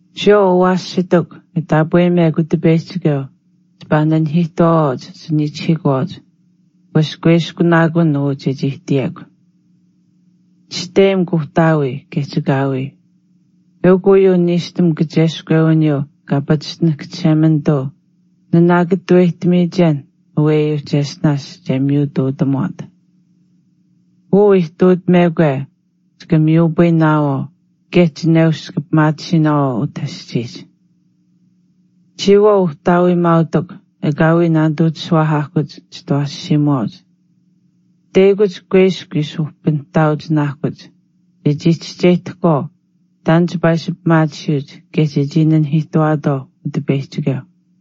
Chiyawaau awaashitikw e taapweyimekw Utipeyihchikeu chipaa naanahiihtuwaawaauch chiniichihiikuwaauch wesh kuiskunaakun uu chechii ihtiyekw. “Chisteyim kuuhtaawii kaye chikaawii.” Eukw uyuu niishtam kacheskwewiniyuu kaa pachishtinahk Chishemanituu nanaakataweyihtamiyichen aweyuuh cheshtinaash che miyutuutamuwaat. Uu ihtuutamekwe “Chika miyupayinaawaau kaye chineush chika pimaatisiinaawaau utah aschiihch.” Chiyawaau uhtaawiimaautikw, ekaawii naanituu chishuwaahaahkuch chitawaashiimuwaauch, teyakuch kuiskw ishi uhpinihtaauchinaahkuch chechii chischeyihtahkwaau taan chipaa ishi pimaatisiyuuch kaye chechii naanahiihtuwaatwaau Utipeyihchikeu.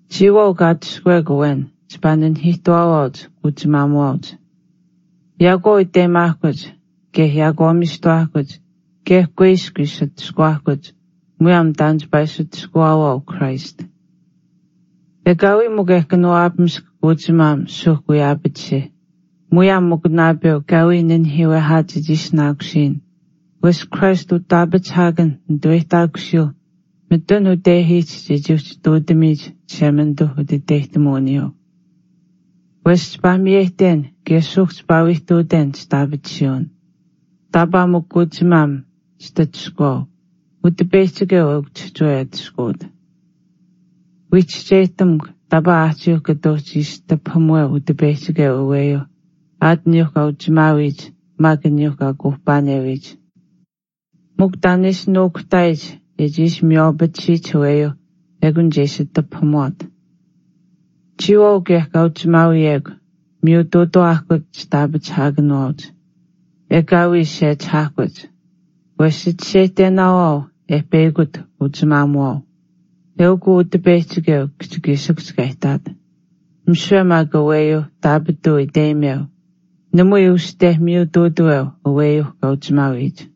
Chiyawaau kaa atushkuwekw awen chipaa nanihiihtuwaawaauch anichii kuuchimaamuwaauch. Yaakwaau iteyimaahkuch kaye yaakwaamiishtuwaahkuch kaye kuiskw ishi atushkuwaahkuch muyaam taan chipaa ishi atushkuwaawaau Christ. Ekaawii mikw e kanawaapamisk kuuchimaam suuhk wii aapatisih muyaam mikw naapeuh kaa wii nanihiiwehaat chechii ishinaakusiyin wesh Christ utaapachihaakanh nituweyihtaakusiyuu mitun utehiihch chechii uhchi ihtuutamiyich Chishemanituuh utiteyihtamuwiniyuu. Wesh chipaa miyeyihten kaye suuhk chipaa wii ihtuuten chitaapatisuwin, taapaa mikw kuuchimaam chitatushkuwaau Utipeyihchikeu eukw chihchiwe e atushkuwat. Wii chischeyihtamukw taapaa aahchiiuh kata uhchi ishi tipahamuweu Utipeyihchikeu aweyuu aat aniyuu kaa uchimaawiyich maak aniyuu kaa kuuhpaanewiyich. Mikw taan e ishi nuukuhtaayich e chii ishi miywaapatisiyich aweyuuh ekun che ishi tipahamuwaat. Chiyawaau kaye kaa uchimaawiyekw, miyutuutawaahkuch chitaapachihaakanuwaauch. Ekaawii sechihaahkuch. Wesh chichischeyihtenaawaau e peyakut kuuchimaamuwaau. Eukw uu Utipeyihchikeu kihchikiishikuhch kaa ihtaat. Misiwe maak aweyuuh taapituu iteyimeu, namui uste miyutuutaweu aweyuu kaa uchimaawiyich.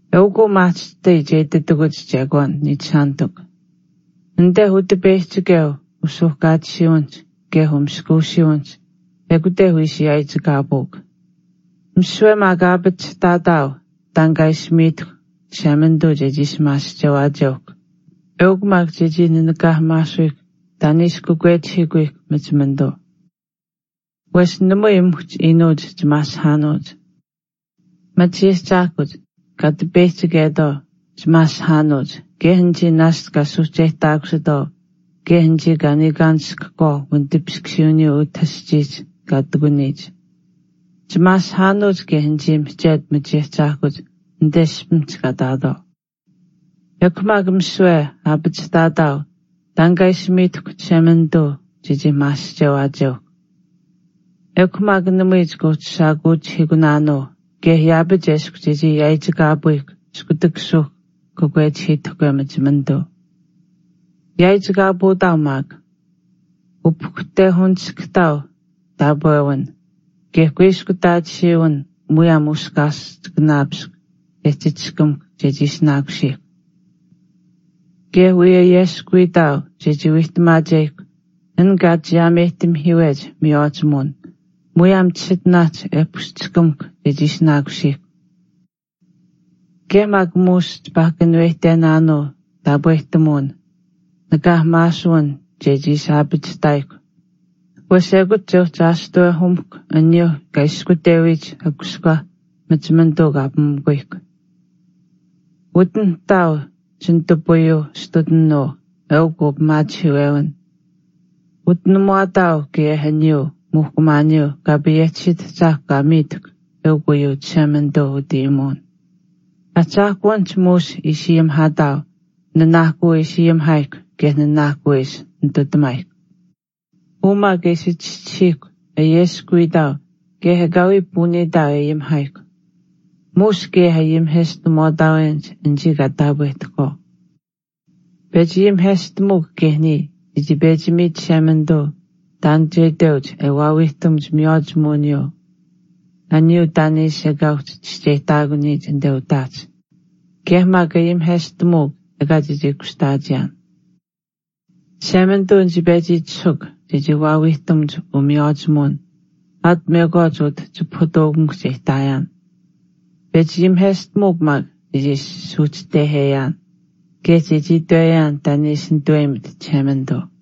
Eukw maahchishtai che ititakuch chekwaan, niichishaanitikw. Anite Utipeyihchikeu usuuhkaatisiiwinihch kaye umaskuusiiwinihch ekute wii ishi yaaichikaapuukw. Misiwe maak aapachihtaataau taan kaa ishi miitahkw Chishemanituu chechii ishi maasihchewaacheuhkw eukw maak chechii naanikaahamaasuyihkw taan e ishi kakwechihiikuyihkw machimanituu. Wesh namui muhch iinuuch chimaasihaanuuch. Machiahchaahkuch kaa tipeyihchichetwaau chimaasihaanuuch kaye anichii naashch kaa suuhcheyihtaakusitwaau kaye anichii kaa niikaanishkahkwaau wanitipiskusiiwiniyuu utah aschiihch kaa ihtakuniyich. Chimaasihaanuuch kaye anichii mihchetu machiahchaahkuch anite ishpimihch kaa ihtaatwaau. Ekw maak misiwe aapachihtaawaataau taan kaa ishi miitahkw Chishemanituu chechii maasihchewaacheuhkw. Ekw maak namui chika uhchi shaakuuchihiikunaanuu kaye yaapach eshkw chechii yaaichikaapuyihkw iskutak suuhk kakwechihiitahkwe machimanituu. Yaaichikaapuutaau maak, e upahkuhtehuniskamuhk taapwewin kaye kuiskutaatisiiwin muyaam miskaaschikanaapiskw e chichishkamuhkw chechii ishinaakusiihkw. Kaye wii ayeskuwiitaau chechii wiihtamaacheyihkw an kaa chiyaameyihtamihiiwech miywaachimuwin muyaam chisitinaahch e pushchishkamuhkw chechii ishinaakusiihkw. Kaye maak muush chipaa kanuweyihtenaanuu taapwehtamuwin nakaahamaasuwin chechii ishi aapachihtaayihkw wesh ekut che uhchi aashtuwehumuhkw aniyuuh kaa ishkutewiyich akuskwah machimanituu kaa pimukuyihkw. Utinihtaau chinitupayuu astutinuu eukuu pimaachihiiwewin, utinamuwaataau kaye aniyuu muuhkumaaniyuu Kaa payehchisiit Ahchaahkw kaa miitahkw eukw uyuu Chishemanituu utayimuwin. Ahchaahkuwinihch muush ishi ayimihaataau nanaahkuu e ishi ayimihchikeyihkw kaye nanaahkuu e ishi nitutamaayihkw. Uu maak e ishi chischisiihkw ayeskuwiitaau kaye ekaawii puuniitaau e ayimihaayihkw, muush kaye ayimiheshtamuwaataawenich anichii kaa taapwehtahkwaau. Pechi ayimiheshtamuukw kaye niya chechii pechi miit Chishemanituu taan che itweuch e waawiihtamuch miywaachimuwiniyuu aniyuu taan e ishi ekaa uhchi chischeyihtaakuniyich anite utaahch kaye maak ayimiheshtamuukw ekaa chechii kushtaachiyaan. Chishemanituu nichii pechi itishahuukw chechii waawiihtamuch umiywaachimuwin aat mekwaach utah chipahutuukamikuhch e ihtaayaan. Pechi ayimiheshtamuukw maak chechii suuhchiteheyaan kaye chechii itweyaan taan e ishi nituweyimit Chishemanituu.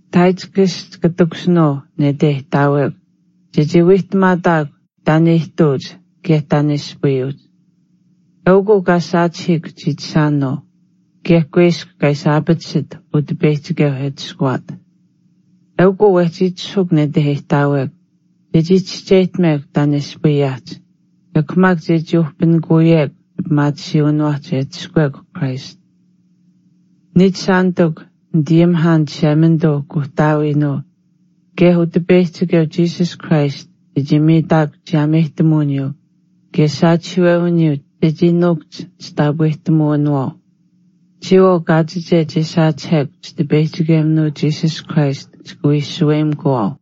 Tychicus chika takushinuu nete e ihtaawekw chechii wiihtamaataakw taan e ihtuuch kaye taan e ispayuuch. Eukw uu kaa saachihiik chiichishaanuu kaye kuiskw kaa ishi aapatatisit Utipeyihchikeu e atushkuwaat. Eukw uu wehchi itishahuuk nete e ihtaawekw chechii chischeyihtamekw taan e ispayaahch ekw maak chechii uhpinikuyekw chipimaatisiiwiniwaahch e atushkuwekw Christ. Nichishaanitikw nitayimihaan Chishemanituu Kuuhtaawiinuu kaye Utipeyihchikeu Jesus Christ chechii miitaakuch chiyaameyihtamuwiniyuu kaye saachihiiwewiniyuu chechii nuukuhch chitaapwehtamuwinawaau. Chiyawaau kaachiche che saachihekw Chitipeyihchikeminuu Jesus Christ chika wii shaweyimikuwaau.